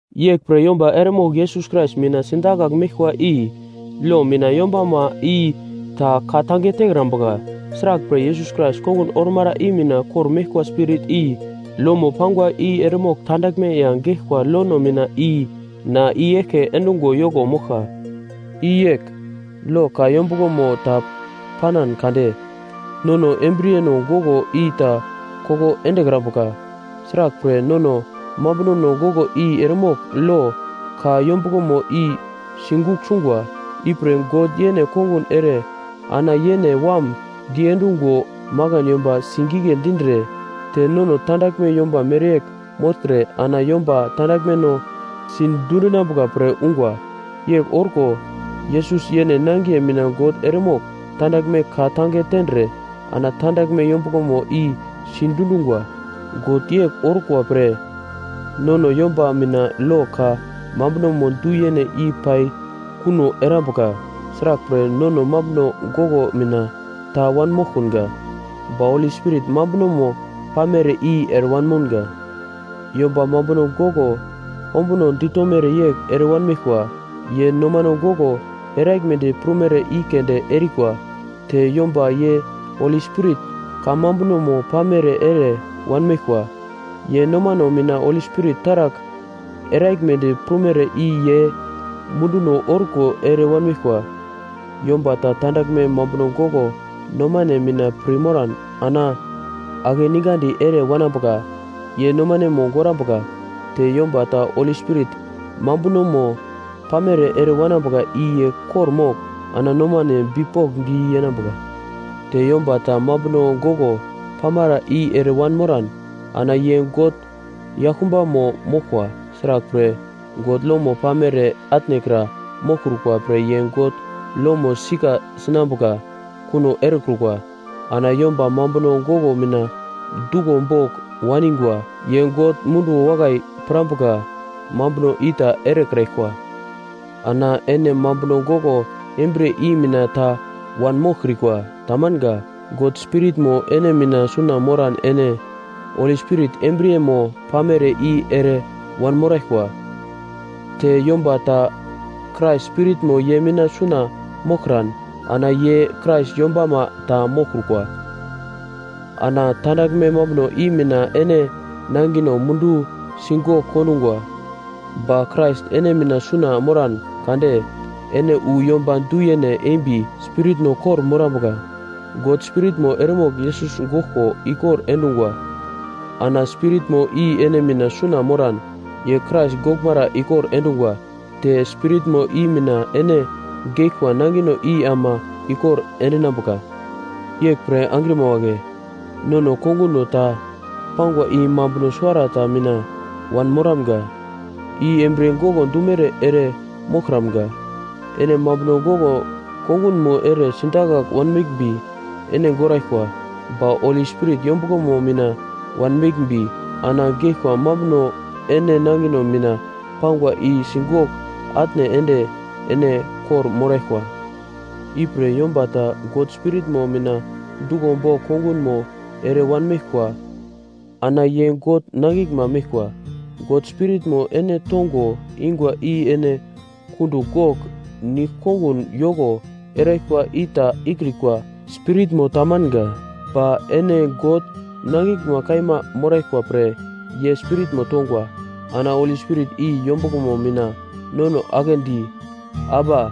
Yeglpre yomba eremogl Yesus Krais mina sidakagl meglkwa i lo mina yombama i ta ka-tange tekrambuka. Sraglpre Yesus Krais kongun ormara i mina kor-meglkwa Spirit i lomo pangwa i eremogl tandaglme ya geglkwa lono mina i na i-eglke endungo yoko moglka. I yegl: Lo ka yombuglomo ta panan kade nono embriyeno goglo i ta koko endekrambuka. Sraglpre, nono mambunono goglo i eremogl lo ka yombuglomo i sigugl sungwa. Ipre God yene kongun ere ana yene Wam diendungo makan yomba singigle dindre te nono tandaglme yomba mereyegl mogltre ana yomba tandaglmeno sidundinambuka pre ungwa. Yegl orko, Yesus yene nangiye mina God eremogl tandaglme ka-tange tendre ana tandaglme yombuglomo i sidundungwa. God yegl orkwa pre nono yomba mina lo ka mambunomo du-yene i pai kuno erambuka. Sraglpre, nono mambuno goglo mina ta wanmoglkunga, ba Holi Spirit mambunomo pamere i ere wanmounga. Yomba mambuno goglo ombuno ditomere yegl ere wanmeglkwa, ye nomano goglo eraglmedi prumere i keunde erikwa. Te yomba ye Holi Spirit kamambunomo pamere ere wanmeglkwa, ye nomano mina Holi Spirit taragl eraglmedi prumere i ye munduno orko ere wanmeglkwa. Yomba ta tandaglme mambuno goglo nomane mina pir moran ana akeningandi ere wanambuka ye nomanemo gorambuka. Te yomba ta Holi Spirit mambunomo pamere ere wanambuka i ye kor-mogl ana nomane bipokndi yenambuka. Te yomba ta mambuno goglo pamara i ere wanmoran ana ye God yaglkumbamo moglkwa. Sraglpre, God lomo pamere atnekra moglkrukwa pre ye God lomo sika sinambuka kuno erekrukwa. Ana yomba mambuno goglo mina duglo bogl waningwa, ye God munduwo wakai pirambuka mambuno i ta erekraglkwa. Ana ene mambuno goglo embriye i mina ta wanmoglkrikwa, tamanga. God Spiritmo ene mina suna moran ene Holi Spirit embriyemo pamere i ere wanmoraglkwa. Te yomba ta Krais Spiritmo ye mina suna moglkran, ana ye Krais yombama ta moglkrukwa. Ana tandaglme mambuno i mina ene nangino mundu sigogl kondungwa. Ba Krais ene mina suna moran kade ene wu yomba du-yene embi spiritno kor-morambuka. God Spiritmo eremogl Yesus goglko ikor endungwa. Ana Spiritmo i ene mina suna moran, ye Krais goglmara ikor endungwa, te Spiritmo i mina ene geglkwa nangino i ama ikor endinambuka. Yeglpre angrima wagle, nono konguno ta pangwa i mambuno suwarata mina wanmoramga, i embriye goglo dumere ere moglkramga. Ene mambuno goglo kongunmo ere sidakagl wanmeglmbi, ene goraglkwa. Ba Holi Spirit yombuglomo mina wanmeglmbi, ana geglkwa mambuno ene nangino mina pangwa i sigogl atne ende ene kor-moraglkwa. Ipre yomba ta God Spiritmo mina duglo bogl kongunmo ere wanmeglkwa ana ye God nangiglma meglkwa. God Spiritmo ene tongo ingwa i ene kundugl gogl nigl-kongun yoko eraglkwa i ta ikrikwa spiritmo tamanga. Ba ene God nangiglma kaima moraglkwa pre Ye Spiritmo tongwa. Ana Holi Spirit i yombuglomo mina nono aglendi, “Aba!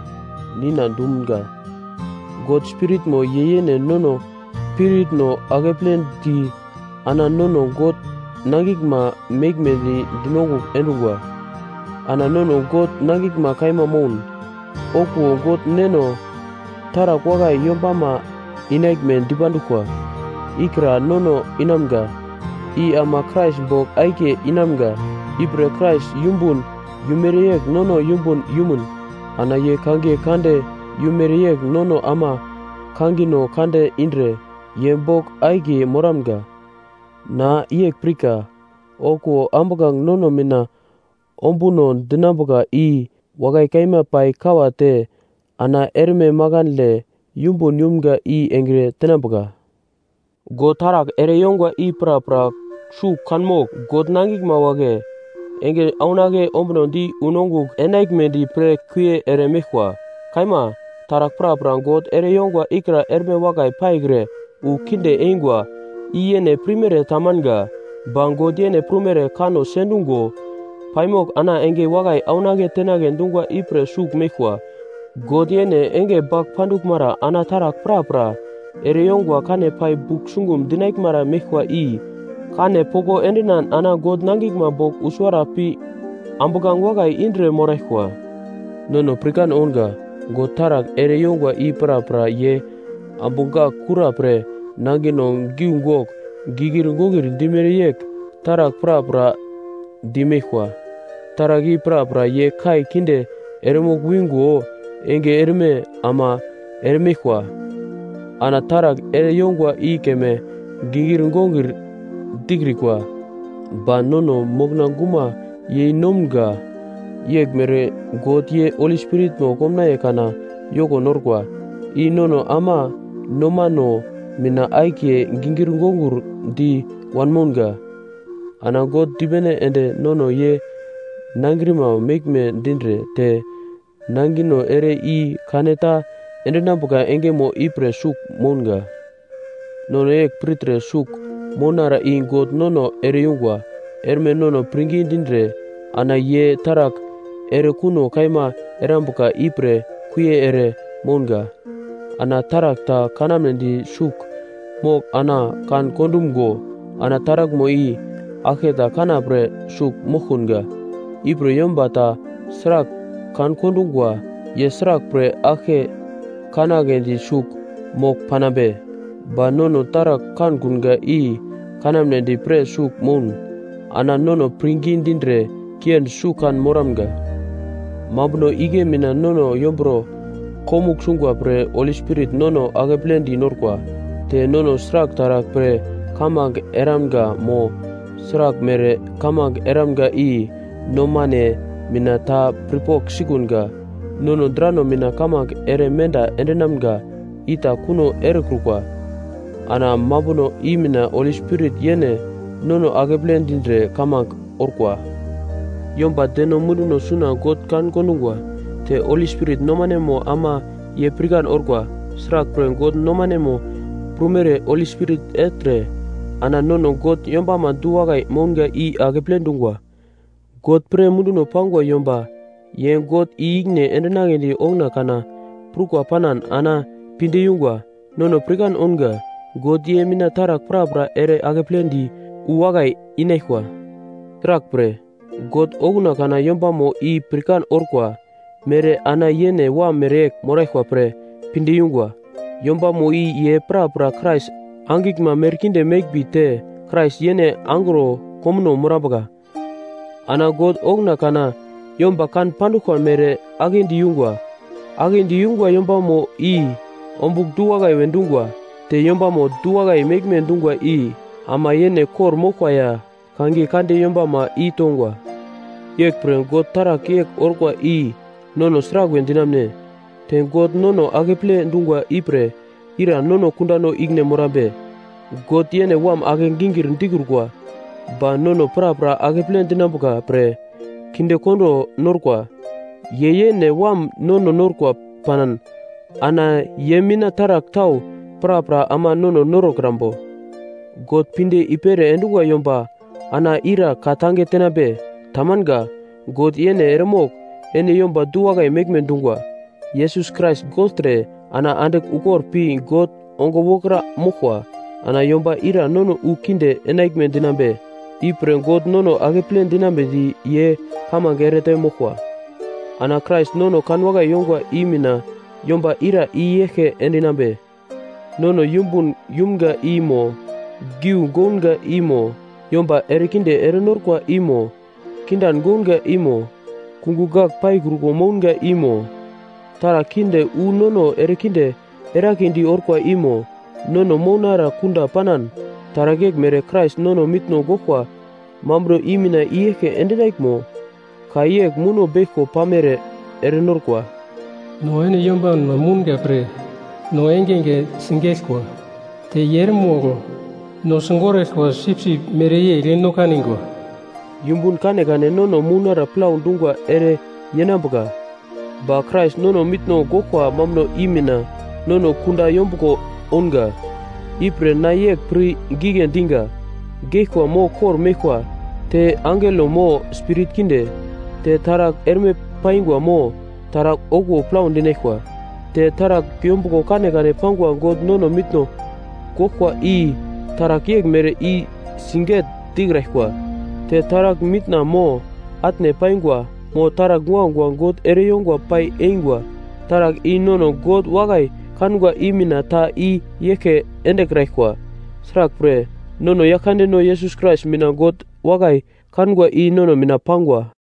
Nina!” dumga. God Spiritmo ye yene nono spiritno akepledi ana nono God nangiglma meglmedi dinongugl endungwa. Ana nono God nangiglma kaima moun, okuwo God Neno taragl wakai yombama inaglme dipanduglkwa ikra nono inamga, i ama Krais bogl akiye inamga. Ipre Krais yumbun yumere yegl nono yumbun yumun ana ye kangiye kande yumere yegl nono ama kangino kande indre ye bogl akiye moramga. Na yegl pirka! Okuwo ambuglange nono mina ombuno dinambuka i wakai kaima pai kawate ana erme makandle yumbun yumga i engre tenambuka. God taragl ere yongwa i prapra sugl kanmogl, God nangiglma wagle enge aunake ombunodi unongugl enaglmedi pre kuie ere meglkwa. Kaima, taragl prapra God ere yongwa ikra erme wakai paikre wu kinde eingwa. I yene pirmere tamanga, ba God yene prumere kanno sendungo paimogl ana enge wakai aunake tenagle dungwa ipre sugl meglkwa. God yene enge bagl panduglmara ana taragl prapra ere yongwa kane pai bugl sungum dinaglmara meglkwa i kane poko endinan ana God nangiglma bogl wu suwara pi ambuglange wakai indre moraglkwa. Nono pirkan ounga, God taragl ere yongwa i prapra ye ambu gak kura pre nangino giugogl gikir wokir dimere yegl taragl prapra dimeglkwa. Taragl i prapra ye kai kinde eremogl wingo enge erme ama eremeglkwa. Ana taragl ere yongwa i keme gingir gongir dikrikwa. Ba nono mokna guma yei nomga yeglmere God ye Holi Spiritmo komnaiye kana yoko norkwa, i nono ama nomano mina akiye gingir gongir di wanmounga. Ana God dipene ende nono ye nangrima meglme dindre te nangino ere i-kane ta endinambuka engemo ipre sugl mounga. Nono yegl pirtre sugl mounara i God nono ere-yungwa. Erme nono pirngi dindre ana ye taragl erekuno kaima erambuka ipre kuie ere mounga. Ana taragl ta kanamnedi sugl mogl ana kan-kondumgo, ana taraglmo i aglketa kanapre sugl moglkunga. Ipre yomba ta sragl kan-kondungwa, ye sraglpre aglke kanagledi sugl mogl panambe? Ba nono taragl kankunga i kanamnedi pre sugl moun, ana nono pirngi dindre kiendi sugl kan moramga. Mambuno igle mina nono yomburo komugl sungwa pre Holi Spirit nono akepledi norkwa. Te nono sragl taragl pre kamange eramga mo sraglmere kamange eramga i nomane mina ta pirpogl sikunga. Nono drano mina kamange ere menda endinamga ita kuno erekrukwa. Ana mambuno i mina Holi Spirit yene nono akeple dindre kamange orkwa. Yomba deno munduno suna God kan-kondungwa. Te Holi Spirit nomanemo ama ye pirkan orkwa. Sraglpre, God nomane prumere Holi Spirit ertre ana nono God yombama du-wakai mounga i akeple dungwa. God pre munduno pangwa yomba, ye God i-ikine endinagledi okuna kana prukwa panan ana pinde yungwa. Nono pirkan ounga, God ye mina taragl prapra ere akeple di wu wakai inaglkwa. Sraglpre, God okuna kana yombamo i pirkan orkwa mere ana yene Wam mereyegl moraglkwa pre pinde yungwa. Yombamo i ye prapra Krais angiglma merkinde meglmbi te Krais yene angro komuno morambuka. Ana God okuna kana yomba kan panduglkwa mere aglendi yungwa, aglendi yungwa yombamo i ombugl du-wakai we dungwa. Te yombamo du-wakai meglme dungwa i, ama yene kor-moglkwa ya kangiye kande yombama i tongwa. Yeglpre God taragl yegl orkwa i nono sraglwe dinamune? Te God nono akeple dungwa ipre ira nono kundano ikine morambe? God yene Wam ake-gingir dikrukwa, ba nono prapra akeple dinambuka pre kindekondo norkwa. Ye yene Wam nono norkwa panan ana ye mina taragl tau prapra ama nono norokrambo? God pinde i-pere endungwa yomba ana ira ka-tange tenambe? Tamanga. God yene eremogl ene yomba du-wakai meglme dungwa. Yesus Krais gogltre ana andigl ukor pi God ongo wokra moglkwa. Ana yomba ira nono wu kinde enaglme dinambe? Ipre God nono akeple dinambedi ye kamange erete moglkwa. Ana Krais nono kanwakai yongwa i mina yomba ira i yeglke endinambe? Nono yumbun yumga i mo, giu gounga i mo, yomba erekinde erenorkwa i mo, kindan gounga i mo, kungugl gagl paikruko mounga i mo, taragl kinde wu nono erekinde eragledi orkwa i mo, nono mounara kunda panan. Taragl yeglmere Krais nono mitno goglkwa mambuno i mina i-eglke endinaglmo? Ka yegl muno beglko pamere erenorkwa: “No ene yombanma mounga pre no engenge sigeglkwa. Te ye eremogl no sigoraglkwa sipsip mereyegl no kanigwa.” Yumbun kanekane nono mounara plau dungwa ere yenambuka, ba Krais nono mitno goglkwa mambuno i mina nono kunda yombuglo ounga. Ipre na yegl pir gigle diga: Geglkwa mo kor-meglkwa, te angelo mo spirit kinde, te taragl erme paingwa mo taragl okuwo plau dinaglkwa, te taragl yombuglo kanekane pangwa God nono mitno goglkwa i taragl yeglmere ta sigegl dikraglkwa, te taragl mitna mo atne paingwa, mo taragl guagua God ereyongo pai eingwa, taragl i nono God wakai kangwa i mina ta i yeglke endekraglkwa. Sraglpre, nono Yaglkandeno Yesus Krais mina God wakai kangwa i nono mina pangwa.